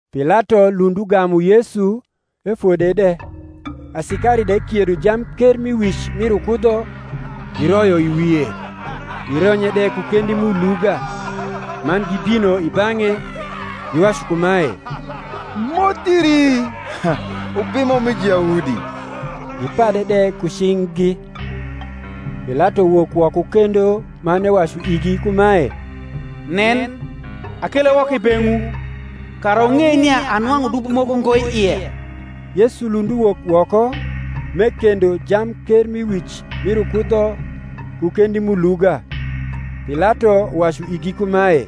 Pilato lund ugamu Yesu, efode de. Asikari de kiedo jamkermiwic mir ukudho, giroyo i wie, gironye de ku kendi m’uluga; man gibino i bang’e, giwacu kumae, Moth iri Ubimo mi Juyahudi! Gipade de ku cing’gi. Pilato wok woko kendo man ewacu igi kumae, Nen, akele woko i beng’wu, kara wung’ei nia anwang’u dubo moko ngo i ie. Yesu lund uwok woko, m’ekendo jamkermiwic mir ukudho ku kendi m’uluga. Pilato wacu igi kumae,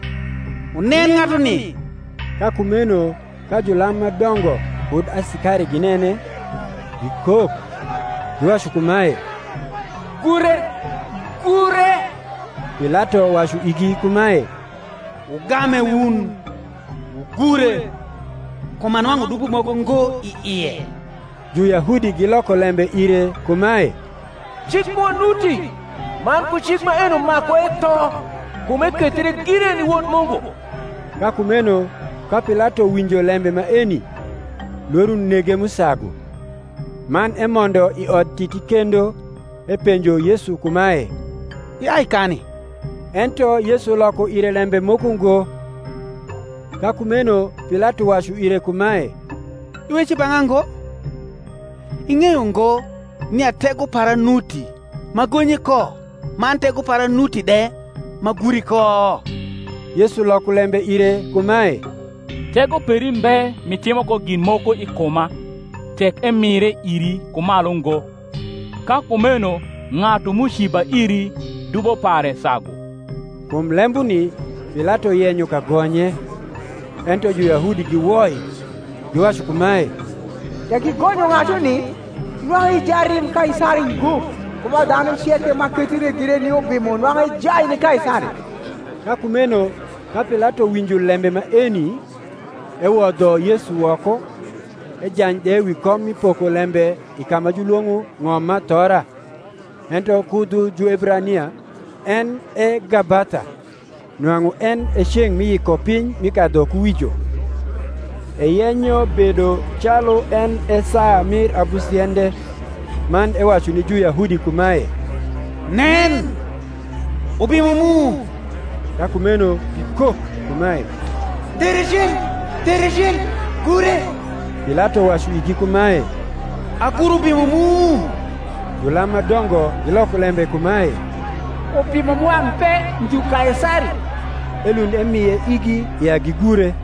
Wunen ng’atuni! Ka kumeno ka julam ma dongo kud asikari ginene, gikok, giwacu kumae, Gure, gure! Pilato wacu igi kumae, Wugame wun, wugure: kum anwang’u dubo moko ngo i ie. Juyahudi giloko lembe ire kumae, Cik mwa nuti, man ku cik maeno maku etho, kum ekethre gire ni Wod Mungu. Ka kumeno ka Pilato winjo lembe maeni, lworo nege m’usagu; man emondo i Odtiti kendo, epenjo Yesu kumae, Iai kani? Ento Yesu loko ire lembe moko ngo. Ka kumeno Pilato wacu ire kumae, Iweco i bang’a ngo? ing’eyo ngo nia tego para nuti m’agonyi ko, man tego para nuti de m’aguri ko? Yesu loko lembe ire kumae, Tego peri mbe m’itimo ko gin moko i kuma, tek emire iri ku malu ngo: ka kumeno ng’atu m’uciba iri dubo pare sagu. Kum lembuni Pilato yenyo kagonye: ento Juyahudi giwoi, giwacu kumae, Tek igonyo ng’atuni, nwang’u i jarim Kaisari ngo: ku ba dhanu ceke ma kethie gire ni ubimo nwang’u ejai ni Kaisari. Ka kumeno ka Pilato winjo lembe maeni, ewodho Yesu woko, ejany de wi kom mi pokolembe i ka ma julwong’o Ng’omathora, ento ku dhu Juebrania en e Gabatha. Nwang’u en e ceng’ mi Yikopiny mi kadhukuwijo: eyenyo bedo calu en e saa mir abusiende. Man ewacu ni Juyahudi kumae, Nen, Ubimo mu! Ka kumeno gikok kumae, Tere cen, tere cen, gure! Pilato wacu igi kumae, Agur Ubimo mu? Julam ma dongo giloko lembe kumae, Ubimo mwa mbe ndhu Kaisari. Elund emie igi ya gigure.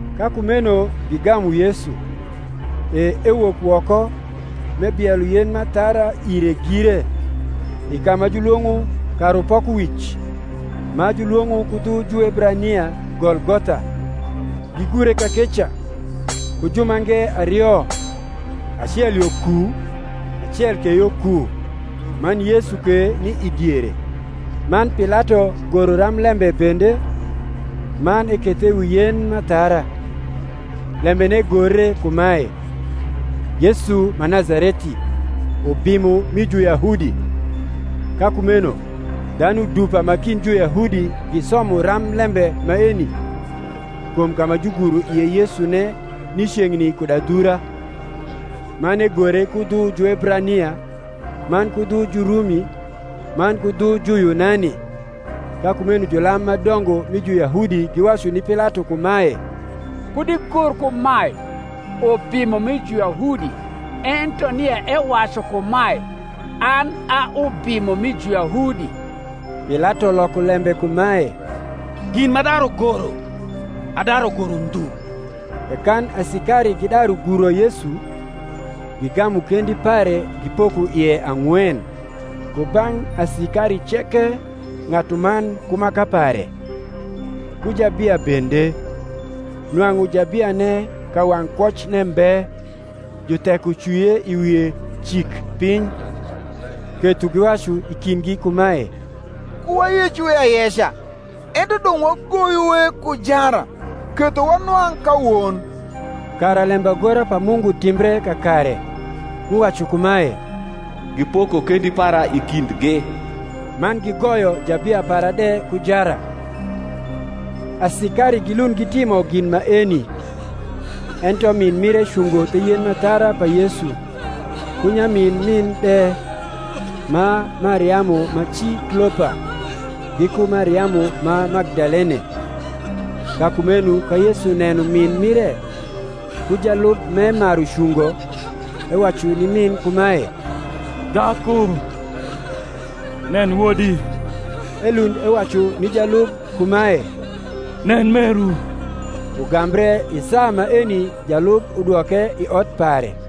Ka kumeno gigamu Yesu: e ewok woko, m’ebielo yen m’athara ire gire, i ka ma julwong’o Karupokowic, ma julwong’o ku dhu Juebrania Golgotha: gigure kakeca, ku jumange ario, acel yo ku, acel ke yo ku, man Yesu ke ni i diere. Man Pilato goro ramblembe bende, man ekethe wi yen m’athara. Lembene gore kumae, YESU MA NAZARETI, UBIMO MI JUYAHUDI. Ka ku meno dhanu dupa ma kind Juyahudi gisomo ramblembe maeni, kum ka ma juguro ie Yesune ni ceng’ni kud adhura; man egore ku dhu Juebrania, man ku dhu Jurumi, man ku dhu Juyunani. Ka kumeno julam ma dongo mi Juyahudi giwacu ni Pilato kumae, Kud igor kumae, Ubimo mi Juyahudi: ento nia ewacu kumae, An a Ubimo mi Juyahudi. Pilato loko lembe kumae, Gin m’adaru goro adaru goro ndhu. E kan asikari gidaru guro Yesu, gigamu kendi pare gipoko ie ang’wen, ku bang’ asikari ceke ng’atuman ku maka pare; ku jabia bende: nwang’u jabiane kawang’ kwocne mbe, jutheko cwie i wie cik piny. Ketho giwacu i kindgi kumae, Ku wayecue ayeca, ento dong’ wagoyue ku jara, ketho wanwang’ ka won: kara lembagora pa Mungu timbre kakare, m’uwacu kumae, Gipoko kendi para i kindgi, Man gigoyo jabia para de ku jara. Asikari gilund gitimo gin maeni. Ento min mire cungo the yen m’athara pa Yesu, ku nyamin min de, ma Mariamu ma ci Klopa, giku Mariamu ma Magdalene. Ka kumeno ka Yesu neno min mire, ku jalub m’emaru cungo, ewacu ni min kumae, Dhaku, nen wodi! Elund ewacu ni jalub kumae, Nen meru! Ugambre i saa maeni jalub udwoke i ot pare.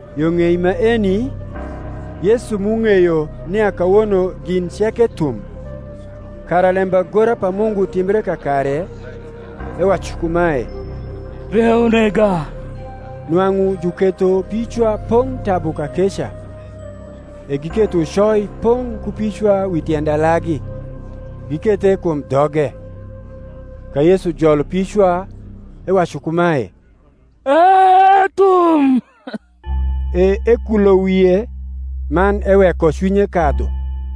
Yo ng’ei maeni, Yesu m’ung’eyo nia kawono gin ceke thum, kara lembagora pa Mungu timbre kakare, ewacu kumae, Rieu unega. Nwang’u juketho picwa pong’ tabu kakeca: e giketho ucoi pong’ ku picwa wi tiend alagi, gikethe kum dhoge. Ka Yesu jolo picwa, ewacu kumae, Ethum: e ekulo wie, man eweko cwinye kadhu.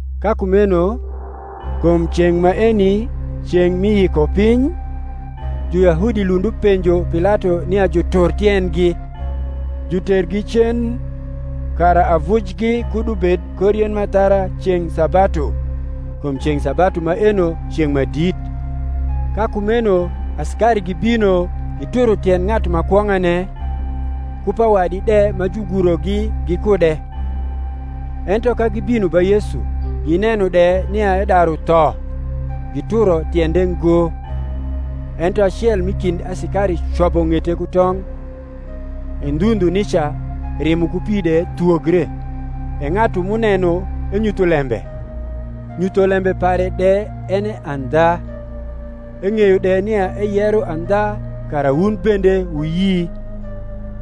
Ka kumeno, kum ceng’ maeni ceng’ mi Yikopiny, Juyahudi lund upenjo Pilato nia jutur tiendgi, jutergi cen, kara avujgi kud ubed kor yen m’athara ceng’ sabatu (kum ceng’ sabatu maeno ceng’ ma dit). Ka kumeno asikari gibino gituro tiend ng’atu ma kwong’ane, ku pa wadi de ma jugurogi gikude; ento ka gibino ba Yesu; gineno de nia edaru tho, gituro tiende ngo: ento acel m’i kind asikari cobo ng’ete ku tong’, e ndhu ndhu nica rimo ku pi de thwogre. E ng’atu m’uneno enyutho lembe, nyutholembe pare de en e andha: eng’eyo de nia eyero andha kara wun bende wuyi.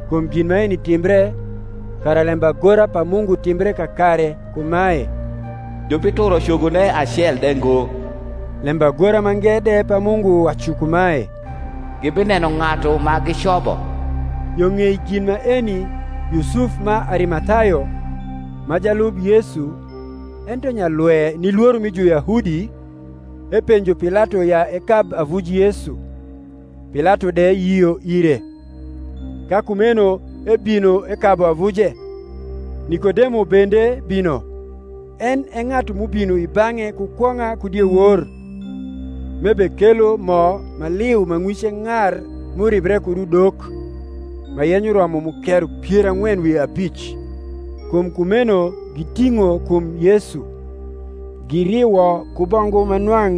Kum gin maeni timbre, kara lembagora pa Mungu timbre kakare kumae, Jubituro cogone acel de ngo. Lembagora mange de pa Mungu wacu kumae, Gibineno ng’atu ma gicobo. Yo ng’ei gin maeni Yusuf ma Arimathayo, ma jalub Yesu, ento nyalwe ni lworo mi Juyahudi, epenjo Pilato ya ekab avuj Yesu: Pilato de yio ire. Ka kumeno ebino ekabu avuje. Nikodemo bende bino, en e ng’atu m’ubino i bang’e ku kwong’a ku diewor, m’ebekelo mo ma liu ma ng’wice ng’ar m’uribre kud udok, ma yenyo romo mukero pier ang’wen wi abic. Kum kumeno giting’o kum Yesu, giriwo ku bongu ma nwang’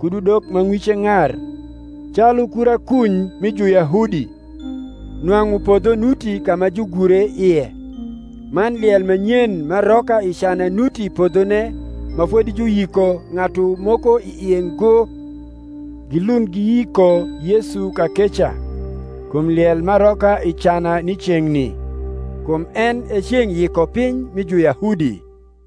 kud udok ma ng’wice ng’ar, calu kura kuny mi Juyahudi. Nwang’u podho nuti ka ma jugure ie; man liel ma nyen m’aroka i cana nuti i podhone ma fodi juyiko ng’atu moko i ie ngo. Gilund giyiko Yesu kakeca (kum liel m’aroka i cana ni ceng’ni) kum en e ceng’ Yikopiny mi Juyahudi.